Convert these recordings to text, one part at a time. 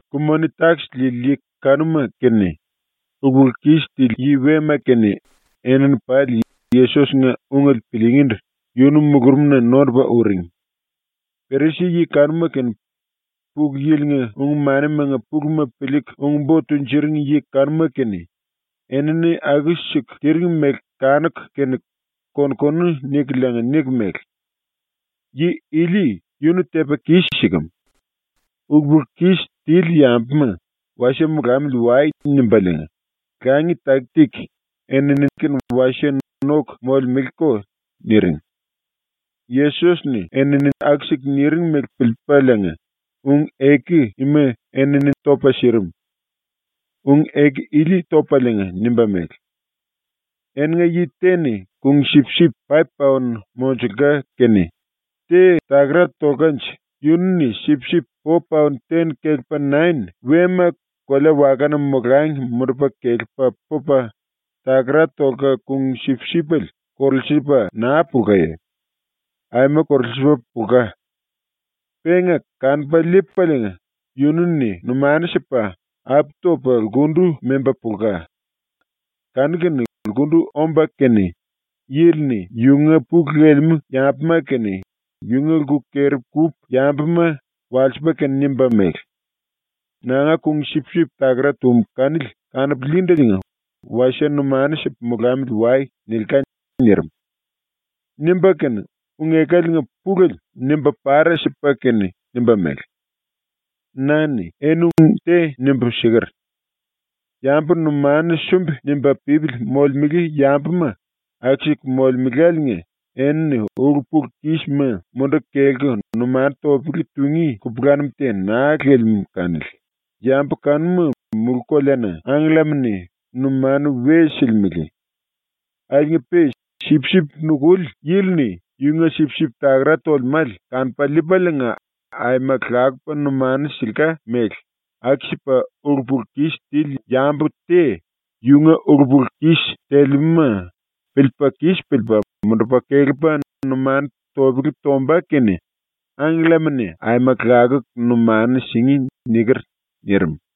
Ku-moni-takis liili yi kanuma kene ulu-pulu-kis tili yi wema kene enini pali Yesos-nga ungele piliingíndu yunu mulurumna nondupa uring. Perisi-yi kanuma kene Pulu Yili-nga ung-manimanga puluma piliiku ung-bo tunjuring yi kanuma kene enini aku-siku tiring mele kanuku kene kon-konu nikuliinga niku mele: “Yi ili yunu tepa kis-sikem. Ulu-pulu-kis tili yambuma “Wasie molamili wai.” nimbaliinga, langi taki-taki enini kene wasie noku molemeleko.” niring. Yesos-ni enini aku-siku niring mele piliipaliinga ⸤ung-eku ima enini topa sirim.⸥ Ung-eku ili topaliinga nimba mele: “Eninga yi te-ni kung-sipsip paip-paon monjulka kene te takara tolkanje yunu-ni sipsip po-paon ten kelepa nain wema kolea-wakana molangi mundupa kelepa pupa, takara tolka kung-sipsipele korulsiliipa naa pulkaye? ⸤Aima korulsiliipa pulka.⸥ Penga kanupa liipaliinga yunu-ni numanu sipa apu topa lkundu memba pulka. Kanu-kene lkundu omba kene yili-ni yunga pulu lelemú yambuma kene yunga lku keri-kúpu yambuma walsipa kene nimba mele: “Nanga kung-sipsip takara tum kanili kanupu liindeliinga wasie numanu sipu molamili wai.” nilka.” ⸤nirim.⸥ ⸤Nimba kene ung-ekaliinga pulele nimba para sipa kene nimba mele:⸥ “Na-ni eni ung te nimbu siker: “Yambu numanu sumbi-nimba pípili molemele yambuma aku-siku molemeláliinga enini ulu-pulu-kisma munduku kelku numanu topele tungí kupulanum te naa lelemú kanili, yambu kanuma mulú-koleana angkellama-ni numanu we silimele. Akiliinga-pe sipsip nukuli yili-ni yunga sipsip takara tolemále kanupa liipaliinga aima lakupa numanu silka mele aku-sipa ulu-pulu-kis tili yambu te yunga ulu-pulu-kis telemúma piliipa kis piliipa mundupa kelepa numanu topele tombá kene angkellama-ni aima lakuku numanu singí.” niker.” ⸤nirim.⸥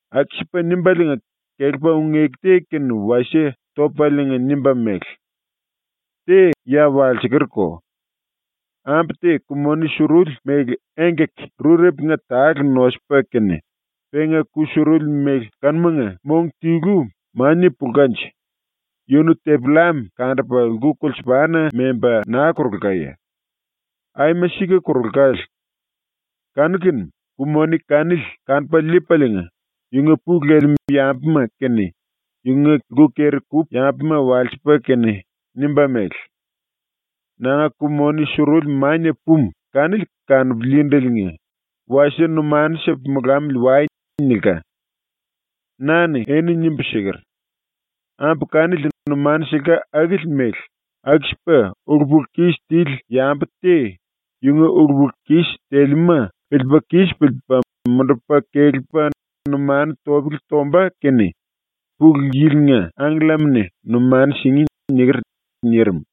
⸤Aku-sipa nimbaliinga kelepa ung-eku te kene wasie topaliinga nimba mele:⸥ “Te ya walsekerko: Ambu te ku-moni suruli mele engkaki-rurepunga tale nosupa kene penga ku-suruli mele kanumanga mong tilu mania pulkanje yunu tepi-llam kandupa lku kulsupana memba naa korulkaye? ⸤Aima sika korulkale.⸥ Kanu-kene ku-moni kanili kanupa liipaliinga yunga pulu lelemú yambuma kene yunga lku keri-kúpu yambuma walsipa kene nimba mele: “Nanga ku-moni suruli mania pumu kanili kanupu liindeliinga wasie numanu sipu molamili wai.” nilka. “Na-ni eni nimbu siker: “Ambu kanili numanu silka akili mele aku-sipa ulu-pulu-kis tili yambu te yunga ulu-pulu-kis telemúma piliipa kis piliipa mundupa kelepa numanu topele tombá kene Pulu Yili-nga angkellama-ni numanu singí.” niker.” nirim.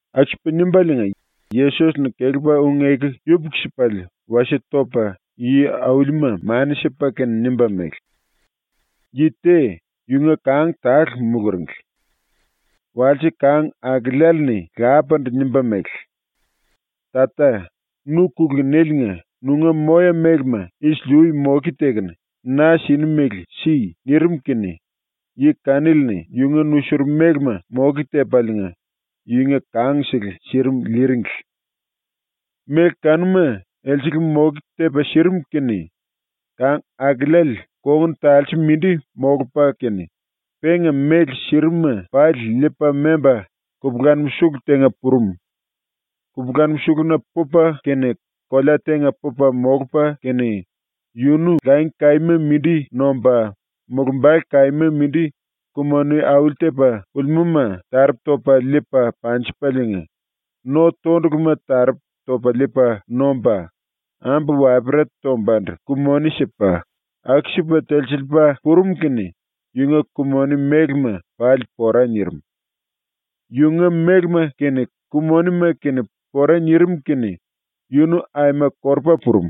⸤Aku-sipa nimbaliinga⸥ Yesos-ni kelepa ⸤ung-eku yupuku-sipale wasie topa yi-aulima mani sipa kene⸥ nimba mele: “Yi te, yunga kang tale muluringli. Walse kang-akeleale-ni lapandu nimba mele: “Tata, nu kulunéliinga nunga moya-mélema isili-ui moke tekunu na sini mele si.” nirim kene yi kanili-ni yunga nusurum mélema moke tepaliinga yunga kangsele sirim liiringli. Méle kanuma elsele moke tepa sirim kene kang-akeleale kongun talse mindi molupa kene, penga méle sirim-ma pali liipa memba kupulanum sulu tenga purum. Kupulanum suluna pupa kene kolea tenga pupa molupa kene yunu langi kaíma mindi nomba, mulumbale kaíma mindi ku-moni auli-tepa pulimúma taropu topa liipa panjipaliinga, no-tonduluma taropu topa liipa nomba, ambu wapera tombandu ku-moni sipa, aku-sipa telsiliipa purum kene yunga ku-moni mélema pali pora nirim. Yunga mélema kene ku-monima kene pora nirim kene yunu aima korupa purum.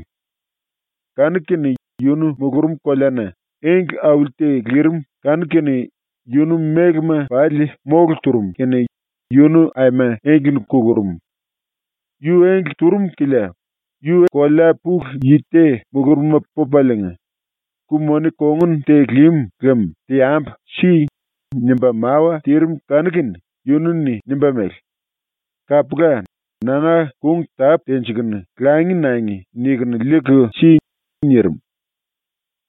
Kanu-kene yunu mulurum koleana engle auli te lirim kanu-kene yunu mélema pali mólu turum kene yunu aima engle-ni kulurum. Yu engle turum kilia kolea pulu yi te mulurumna pupaliinga “Ku-moni kongun te lim lem teambu si.” nimba mawa tirim kanu-kene yunu-ni nimba mele: “Kapula, nanga kung tápu tenjikunu ‘Langi nangi.’ nikunu liiku si.” nirim.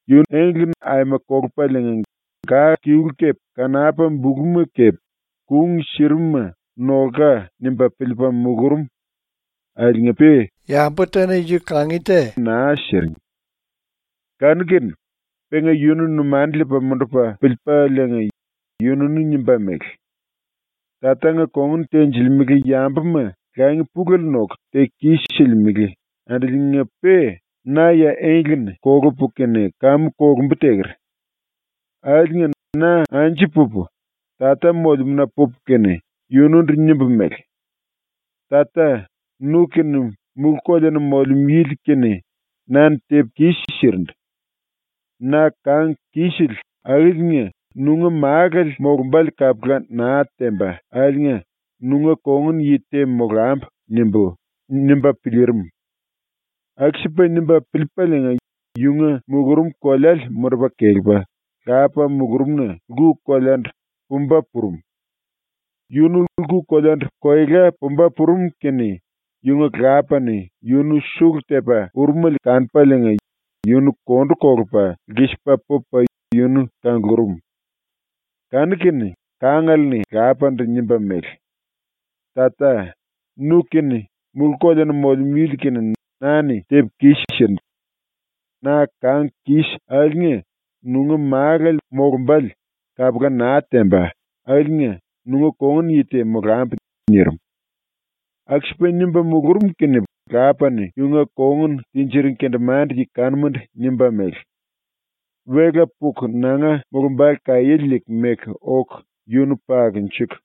⸤Engle-ni aima kolupaliinga⸥ ga-kilu kepe kanapa-buluma kepe kung sirim-ma ‘Nolka.’ nimba piliipa mulurum akiliinga-pe te naa siring. Kanu-kene penga yunu numanu liipa mundupa piliipaliinga yununu nimba mele: ‘Tatanga kongun tenjilimele yambuma langi pulele noku teku kis-silimele andiliinga-pe na ya engle-ni kolupu kene kamu kolumbu teker. Akiliinga na anju pupu Tata molemúna pupu kene yunundu nimbu mele: “Tata, nu kene Mulú-Koleana Molemú Yili kene na-ni tepu kis-sirindu. Na kang kisele akiliinga nunga málale molumbále kapula naa temba akiliinga nunga kongun-yi te molambu.” nimbú.’ nimba piliirim. Aku-sipa nimba piliipaliinga yunga mulurum koleale mundupa kelepa, lapa mulurumna ⸤lku koleandu⸥ pumba purum. Yunu lku koleandu koela pumba purum kene yunga lapa-ni yunu sulu tepa urumele kanupaliinga yunu kondu kolupa lkisipa pupa yunu kanglurum. Kanu-kene kangale-ni lapandu nimba mele: “Tata, nu-kene Mulú-Koleana Molemú Yili-kene na-ni tepu kis-sirindu. Na kang kis akiliinga nunga málale molumbále kapula naa temba akiliinga nunga kongun yi te molambu.” nirim. Aku-sipa nimba mulurum kene lapa-ni yunga kongun tinjiring kendemande-yi kanumandu nimba mele: “Wela puku nanga mulumbale kaiéle liiku meku oku yunu pakunjuku,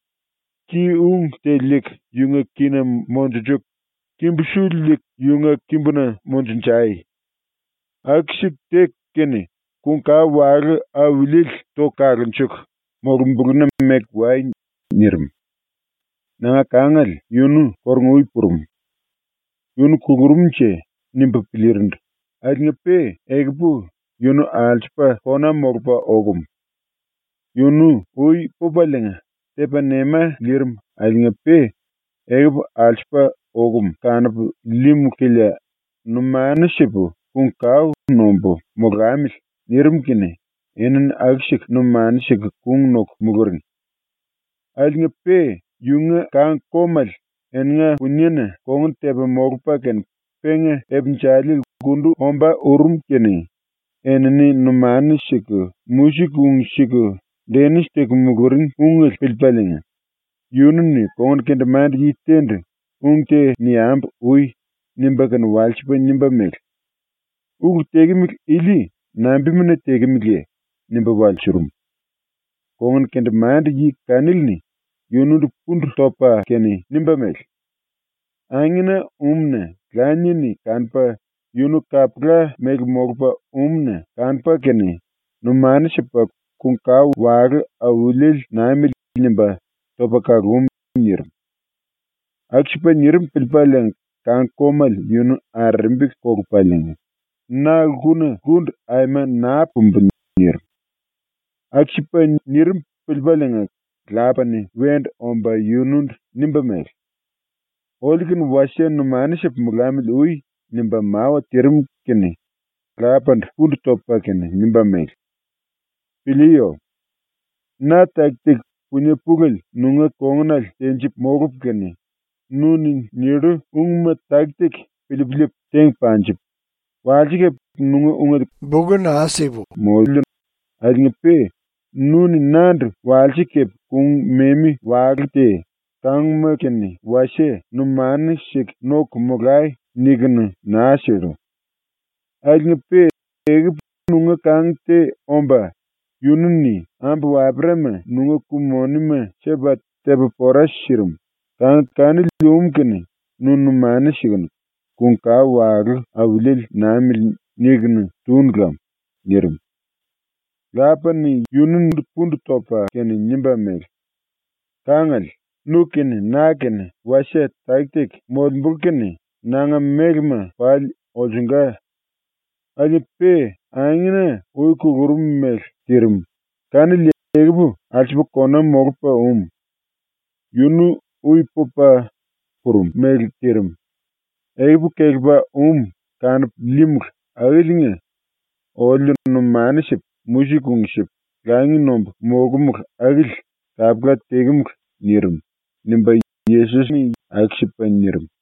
ki-ung te liiku yunga kína monjunjuku, kimbu-su liiku yunga kimbuna monjunjai. Aku-siku teku kene kung-kao walú auliele toku kalunjuku, molumbulúna meku wai.” nirim. “Nanga kangale yunu kórunga-ui purum, ‘Yunu kulurum⸤-nje.’ nimbu piliirindu⸥ akiliinga-pe ekupu yunu alsupa kona molupa okum. Yunu ui pupaliinga tepa nema liirim akiliinga-pe ekupu alsupa okum kanupu líímulu kilia numanu sipu kung kao nombu molamili.” nirim kene enini aku-siku numanu siku kung noku muluring. Akiliinga-pe yunga kang-komale eninga puniena kongun tepa molupa kene penga ipinjali lkundu ombá urum kene enini numanu siku musik ung siku denis teku muluring ungele piliipaliinga yunu-ni kongun kendemande-yi te-ndu “Ung te niambu ui.” nimba kene walsipa nimba mele: “Ulu tekemele ili nambimuna tekemeleye?” nimba walsurum. Kongun kendemande-yi kanili-ni yunundu pundu topa kene nimba mele: “Angena um-na lanie-ni kanupa yunu kapula mele molupa um-na kanupa kene numanu sipa “Kung-kao walú auliele namili.” nimba topa kalum.” nirim. Aku-sipa nirim piliipaliinga kang-komale yunu arerembi kolupaliinga “Na lkuna lkundu aima naa pumbu!” nirim. Aku-sipa nirim piliipaliinga lapa-ni wendu omba yunundu nimba mele: “Oliu-kene wasie numanu sipu molamili ui.” nimba mawa tirim kene lapandu pundu topa kene nimba mele: “Piliiyo! Na taki-taki, punie pulele, nunga kongunale tenjipu molupu kene nu-ni nillu ungma taki-taki piliipu liipu teng panjipu, walse kepe nunga ungele karaye naa tepu moliu akiliinga-pe nu-ni nandu walse kepe kung-memi walú te ‘Kánguma-kene wasie numanu siku noku molai.’ nikunu naa sillu. Akiliinga-pe ekupu nunga kang te omba, yunu-ni ambu-waperama nunga ku-monima sipa tepa pora sirim, kang kanili um kene nu numanu sikunu ‘Kung-kao walú auliele namili.’ nikunu túnu lam.” nirim. Lapa-ni yunundu pundu topa kene nimba mele: “Kangale, nu kene na kene wasie taki-taki molembulu kene nanga mélema pali olsunga. Akiliinga-pe angena ui kulurum ⸤mele tirim⸥ kanili ekupu alsupa kona molupa um. Yunu ui pupa purum ⸤mele tirim⸥, ekupu kelepa um kanupu líímulu akiliinga oliu numanu sipu musik ung sipu langi nombu molkumulu akili kapula tekemulu.” nirim.” ⸤nimba Yesos-ni⸥ aku-sipa nirim.